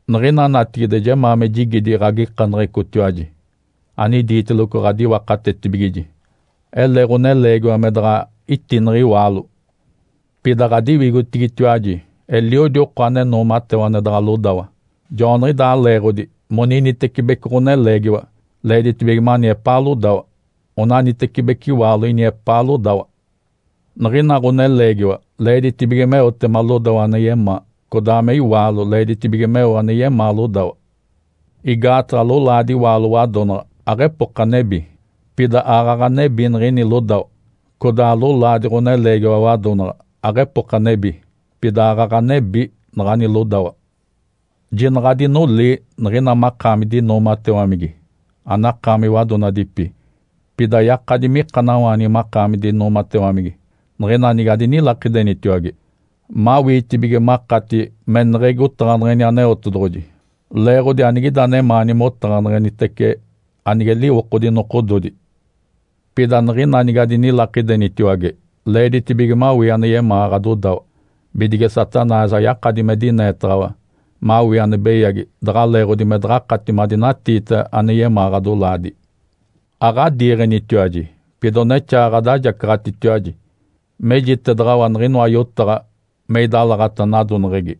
Niɡ̶ina natigide jemaa me jigidi ɡ̶agikaneɡ̶ecotiwaji anidiiteloco ɡ̶adiwakatetibigiji. Ele ɡ̶oneleegiwa me daɡ̶a itineɡ̶e iwaalo. Pida ɡ̶adiwigotigitiwaji eliodi oko ane noomatewa ane daɡ̶a lodawa. Joaniɡ̶idaa leeɡ̶odi moninitecibeci ɡ̶oneleegiwa leeditibige mani epaa lodawa, onanitecibeci iwaalo ini epaa lodawa. Niɡ̶ina ɡ̶oneleegiwa leeditibige meotema lodawa ane yemaa, codaa me iwaalo leeditibige meo ane yemaa lodawa. Igaataɡ̶a lolaadi iwaalo wadonaɡ̶a aɡ̶epoka nebi, pida aaɡ̶aɡ̶a nebi niɡ̶ini lodawa. Codaa lolaadi ɡ̶oneleegiwa wadonaɡ̶a aɡ̶epoka nebi, pida aaɡ̶aɡ̶a nebi naɡ̶ani lodawa. Jinaɡ̶a adinolii niɡ̶ina makaami dinoomatewamigi anakaami wadonadipi. Pida yakadi mikanawaanigi makaami dinoomatewamigi niɡ̶ina nige adinilakidenitiwage, mawiitibige makati meneɡ̶egi otaɡ̶aneɡ̶eni Aneotedoɡ̶oji leeɡ̶odi anigida anemaani motaɡ̶aneɡ̶enitece anige liwokodi nokododi. Pida niɡ̶ina nige adinilakidenitaciwage leeditibige mawii ane yemaa ɡ̶adodawa, bidige Satanás ayakadi me dineetaɡ̶awa mawii ane beyagi daɡ̶a leeɡ̶odi me daɡ̶akati madinatiita anemaani ɡ̶adolaadi. Aɡ̶adiiɡ̶enitiwaji, pida onexaa ɡ̶adajacaɡ̶atitiwaji, mejitedaɡ̶awa niɡ̶inoa yotaɡ̶a me idalaɡ̶ata nadoneɡ̶egi.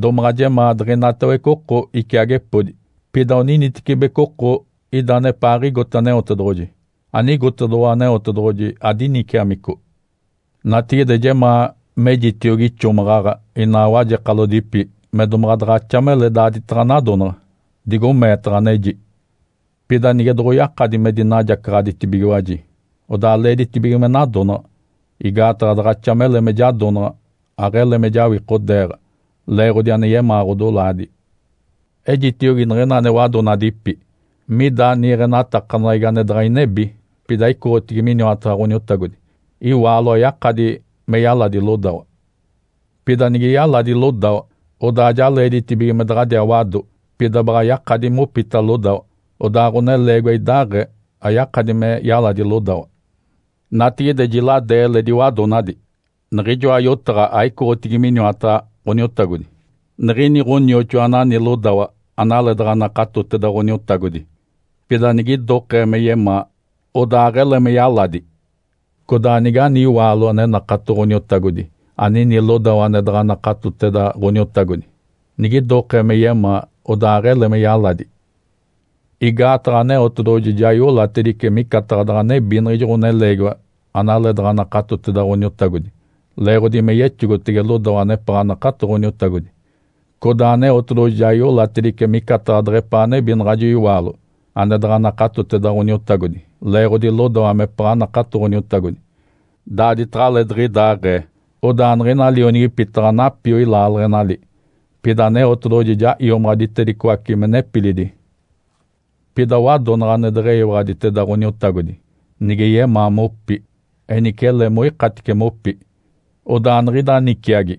Domaɡ̶a jemaa diɡ̶inatawece oko iciagepodi. Pida oninitecibeci oko ida anepaaɡ̶igote Aneotedoɡ̶oji, anigotedoɡ̶owa Aneotedoɡ̶oji adiniciamico. Natigide jemaa mejitiogi ixomaɡ̶aɡ̶a inaa wajekalodipi me domaɡ̶a daɡ̶axa mele daaditaɡ̶a nadonaɡ̶a, digo meetaɡ̶a, aneji. Pida nige doɡ̶oyakadi me dinajacaɡ̶aditibigiwaji, odaa leeditibige me nadonaɡ̶a. Igaataɡ̶a daɡ̶axa mele me jadonaɡ̶a, aɡ̶ele me jawikodeeɡ̶a leeɡ̶odi ane yemaa ɡ̶odolaadi. Ejitiogi niɡ̶ina ane wadonadipi. Mida niiɡ̶enatakaneɡ̶egi ane daɡ̶a inebi, pida icoɡ̶otigi miniwataɡ̶a Ǥoniotagodi. Iwaalo ayakadi me yaladi lodawa. Pida nige yaladi lodawa, odaa ja leeditibige me daɡ̶adiaa wado, pida baɡ̶a yakadi mopita lodawa. Odaa ɡ̶oneleegiwa idaaɡ̶ee, ayakadi me yaladi lodawa. Natigide jiladee eletidi wadonadi. Niɡ̶ijoa yotaɡ̶a aicoɡ̶otigi miniwataɡ̶a Ǥoniotagodi. Nigini ɡ̶onioxoa anani lodawa analeedaɡ̶a nakatoteda Ǥoniotagodi, pida nigidokee me yemaa, odaa aɡ̶ele me yaladi. Codaa nigani iwaalo ane nakato Ǥoniotagodi anini lodawa ane daɡ̶a nakatoteda Ǥoniotagodi, nigidokee me yemaa, odaa aɡ̶ele me yaladi. Igaataɡ̶a Aneotedoɡ̶oji ja iolatedice micataɡ̶a daɡ̶a nebi niɡ̶ijo ɡ̶oneleegiwa analeedaɡ̶a nakatoteda Ǥoniotagodi leeɡ̶odi me yexogotege lodawa anepaɡ̶a nakato Ǥoniotagodi. Codaa Aneotedoɡ̶oji ja iolatedice micataɡ̶a deɡ̶epaa nebi naɡ̶ajo iwaalo ane daɡ̶a nakatoteda Ǥoniotagodi leeɡ̶odi lodawa mepaɡ̶a nakato Ǥoniotagodi. Daaditaɡ̶alee diɡ̶idaaɡ̶ee, odaa niɡ̶ina lionigipi taɡ̶a napioi laaleɡ̶enali. Pida Aneotedoɡ̶oji ja iomaɡ̶aditedicoace me nepilidi. Pida wadonaɡ̶a ane deɡ̶eyiwaɡ̶aditeda Ǥoniotagodi, nige yemaa mopi, enice ele moikatice mopi. Odaa niɡ̶ida niciagi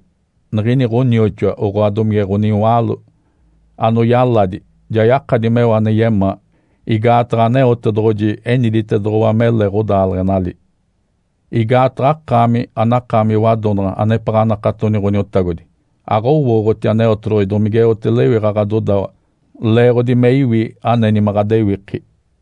niɡ̶ini ɡ̶onioxoa oɡ̶oa domige ɡ̶oniwaalo anoyaladi ja yakadi meo ane yemaa, igaataɡ̶a Aneotedoɡ̶oji eniditedoɡ̶owa mele ɡ̶odaaleɡ̶enali. Igaataɡ̶a akaami, anakaami wadonaɡ̶a anepaɡ̶a anakatoni Ǥoniotagodi, aɡ̶owooɡ̶oti Aneotedoɡ̶oji domigeote lewiɡ̶a ɡ̶adodawa leeɡ̶odi me iwi aneni me ɡ̶adewiki.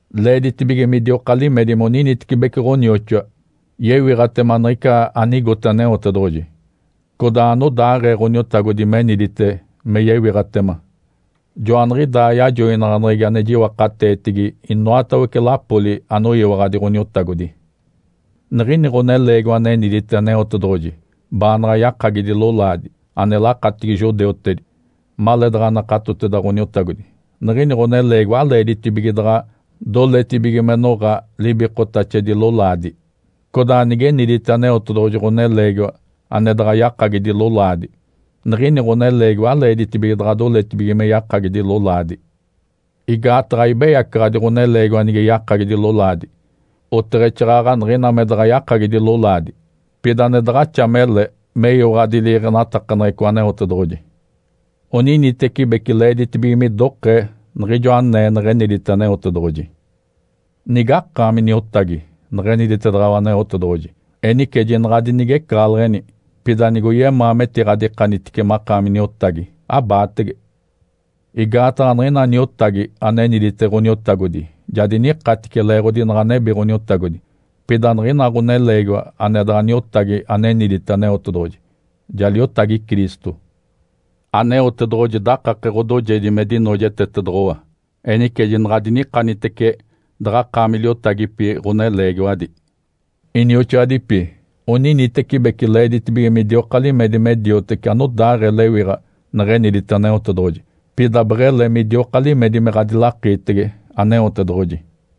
Leeditibige midioka limedi moninitecibeci ɡ̶onioxoa yewiɡ̶atema niɡ̶ica anigote Aneotedoɡ̶oji, codaa anodaaɡ̶ee Ǥoniotagodi menidite me yewiɡ̶atema. Joaniɡ̶idaa yajoinaɡ̶aneɡ̶egi ane jiwakateetigi inoatawece lapoli anoyiwaɡ̶adi Ǥoniotagodi. Nigini ɡ̶oneleegiwa anenidite Aneotedoɡ̶oji baanaɡ̶a yakagidi lolaadi, ane lakatigi judeutedi, maleedaɡ̶a nakatoteda Ǥoniotagodi, niɡ̶ini ɡ̶oneleegiwa aleeditibige daɡ̶a doletibige me noɡ̶a libikotaxedi lolaadi. Codaa nigenidite Aneotedoɡ̶oji ɡ̶oneleegiwa ane daɡ̶a yakagidi lolaadi, niɡ̶ini ɡ̶oneleegiwa aleeditibige daɡ̶alee doletibige me yakagidi lolaadi. Igaataɡ̶a aibeyacaɡ̶adi ɡ̶oneleegiwa nige yakagidi lolaadi, oteɡ̶exaaɡ̶aɡ̶a niɡ̶ina me daɡ̶a yakagidi lolaadi. Pida ane daɡ̶axa mele meyiwaɡ̶adi liiɡ̶enatakaneɡ̶eco Aneotedoɡ̶oji. Oninitecibeci leeditibige midokee niɡ̶ijo anee neɡ̶enidite Aneotedoɡ̶oji. Nigakaami niotagi neɡ̶eniditedaɡ̶awa Aneotedoɡ̶oji? Enice jinaɡ̶a adinigecaɡ̶aleɡ̶eni! Pida nigoyemaa metiɡ̶adikanitice makaami niotagi, abaatege. Igaataɡ̶a niɡ̶ina niotagi anenidite Ǥoniotagodi ja dinikatice leeɡ̶odi naɡ̶a nebi Ǥoniotagodi. Pida niɡ̶ina ɡ̶oneleegiwa ane daɡ̶a niotagi anenidite Aneotedoɡ̶oji ja liotagi Cristo. Aneotedoɡ̶oji dakake ɡ̶odoojedi me dinoojetetedoɡ̶owa, enice jinaɡ̶adinikanitece daɡ̶akaami liotagipi ɡ̶oneleegiwadi! Inioxoadipi, oninitecibeci leeditibige midioka limedi me dioteci anodaaɡ̶ee lewiɡ̶a neɡ̶enidite Aneotedoɡ̶oji, pida beɡ̶ele midioka limedi me ɡ̶adilakiitege Aneotedoɡ̶oji.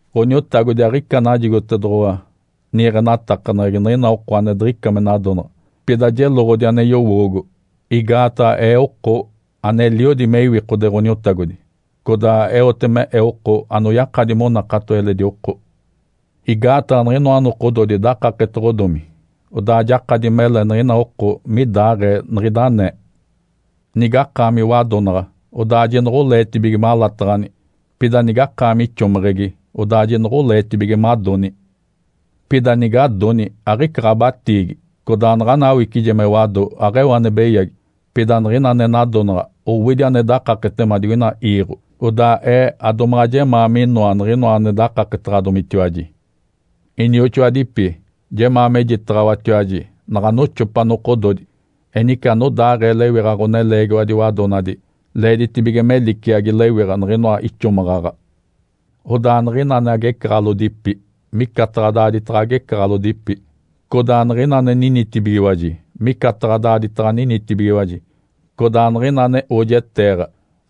Ǥoniotagodi aɡ̶ica najigotedoɡ̶owa niiɡ̶enatakaneɡ̶egi niɡ̶ina oko ane diɡ̶ica me nadonaɡ̶a. Pida jeloɡ̶odi ane yowoogo, igaataɡ̶a ee oko aneliodi me iwikode Ǥoniotagodi, codaa eote me ee oko, anoyakadi monakato eledi oko. Igaataɡ̶a niɡ̶inoa nokododi dakaketoɡ̶odomi. Odaa jakadi mele niɡ̶ina oko midaaɡ̶ee niɡ̶ida anee. Nigakaami wadonaɡ̶a, odaa jinoɡ̶oleetibige malataɡ̶ani. Pida nigakaami ixomeɡ̶egi, odaa jinoɡ̶oleetibige madoni. Pida nigadoni, aɡ̶ica ɡ̶abatiigi. Codaa naɡ̶ana awicije me wado, aɡ̶eo ane beyagi. Pida niɡ̶ina ane nadonaɡ̶a owidi ane dakaketema digoina iiɡ̶o. Odaa ee adomaɡ̶a jemaa minoa niɡ̶inoa ane dakaketaɡ̶adomitiwaji. Inioxoadipi, Jemaa mejitaɡ̶awatiwaji naɡ̶a noxopa nokododi. Enice anodaaɡ̶ee lewiɡ̶a ɡ̶oneleegiwadi wadonadi leeditibige me liciagi lewiɡ̶a niɡ̶inoa ixomaɡ̶aɡ̶a. Odaa niɡ̶ina ane agecaɡ̶alodipi micataɡ̶a daaditaɡ̶a agecaɡ̶alodipi. Codaa niɡ̶ina ane ninitibigiwaji micataɡ̶a daaditaɡ̶a ninitibigiwaji. Codaa niɡ̶ina ane oojeteeɡ̶a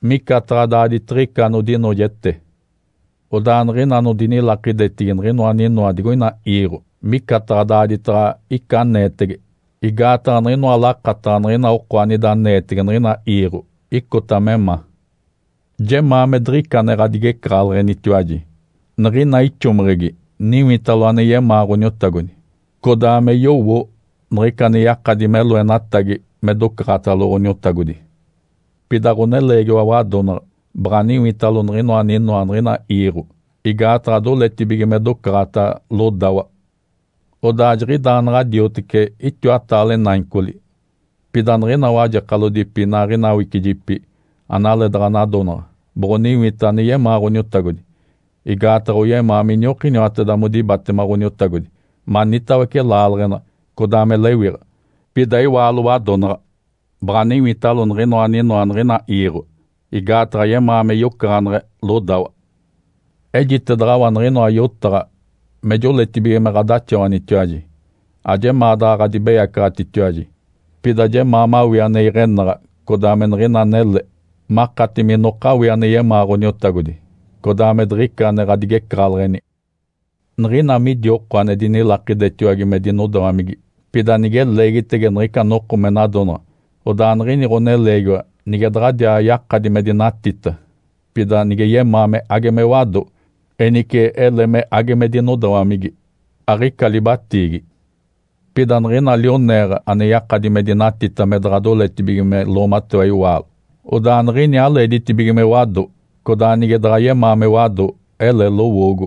micataɡ̶a daaditiɡ̶ica anodinoojete. Odaa niɡ̶ina anodinilakidetigi niɡ̶inoa aninoa digoina iiɡ̶o micataɡ̶a daaditaɡ̶a ica aneetege. Igaataɡ̶a niɡ̶inoa lakataɡ̶a niɡ̶ina oko anida aneetege niɡ̶ina iiɡ̶o icota me ma. Jemaa me diɡ̶ica ane ɡ̶adigecaɡ̶aleɡ̶enitiwaji. Niɡ̶ina ixomeɡ̶egi niwitalo ane yemaa Ǥoniotagodi, codaa me yowo niɡ̶ica ane yakadi me loenatagi me docaɡ̶atalo Ǥoniotagodi. Pida ɡ̶oneleegiwa wadonaɡ̶a baɡ̶a niwitalo niɡ̶inoa aninoa niɡ̶ina iiɡ̶o, igaataɡ̶a doletibige me docaɡ̶ata lodawa. Odaa jiɡ̶idaa naɡ̶a dioteci itiwataale naicoli. Pida niɡ̶ina wajekalodipi inaaɡ̶ina awicijipi analee daɡ̶a nadonaɡ̶a boɡ̶oniwita ane yemaa Ǥoniotagodi. Igaataɡ̶a oyemaa miniokiniwateda modibatema Ǥoniotagodi manitawece laaleɡ̶ena codaa me lewiɡ̶a. Pida iwaalo wadonaɡ̶a baɡ̶a niwitalo niɡ̶inoa aninoa niɡ̶ina iiɡ̶o igaataɡ̶a yemaa me yocaɡ̶aneɡ̶e lodawa. Ejitedaɡ̶awa niɡ̶inoa yotaɡ̶a me joletibige me ɡ̶adaxawanitiwaji, ajemaa daɡ̶a ɡ̶adibeyacaɡ̶atitiwaji. Pida jemaa mawii ane iɡ̶enaɡ̶a codaa me niɡ̶ina anele, makati minokawii ane yemaa Ǥoniotagodi, codaa me diɡ̶ica ane ɡ̶adigecaɡ̶aleɡ̶eni. Niɡ̶ina midi oko ane dinilakidetiwage me dinodawamigi, pida nige leegitege niɡ̶ica noko me nadonaɡ̶a, odaa niɡ̶ini ɡ̶oneleegiwa nige daɡ̶adiaa yakadi me dinatita, pida nige yemaa me age me wado, enice ele me age me dinodawamigi. Aɡ̶ica libatiigi. Pida niɡ̶ina lioneeɡ̶a ane yakadi me dinatita me daɡ̶a doletibige me loomatewa iwaalo, odaa niɡ̶ini aleeditibige me wado, codaa nige daɡ̶a yemaa me wado, ele lowoogo.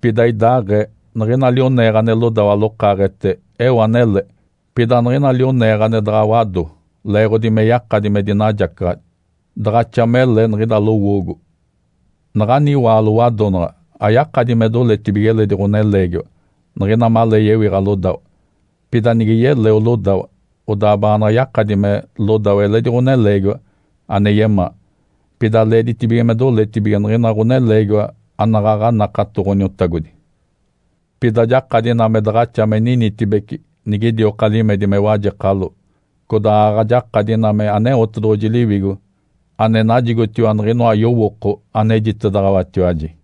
Pida idaaɡ̶ee, niɡ̶ina lioneeɡ̶a ane lodawa lokaaɡ̶ete eo anele. Pida niɡ̶ina lioneeɡ̶a ane daɡ̶a wado leeɡ̶odi me yakadi me dinajacaɡ̶adi, daɡ̶axa mele niɡ̶ida lowoogo. Naɡ̶ani iwaalo wadonaɡ̶a ayakadi me doletibige eledi ɡ̶oneleegiwa niɡ̶ina malee yewiɡ̶a lodawa. Pida nige yeleo lodawa, odaa baanaɡ̶a yakadi me lodawa eledi ɡ̶oneleegiwa ane yemaa, pida leeditibige me doletibige niɡ̶ina ɡ̶oneleegiwa anaɡ̶aɡ̶a nakato Ǥoniotagodi. Pida jakadi ina me daɡ̶axa me ninitibece nigidioka limedi me wajekalo. Codaa aaɡ̶aɡ̶a jakadi ina me Aneotedoɡ̶oji Liwigo ane najigotiwa niɡ̶inoa yowooko anejitedaɡ̶awatiwaji.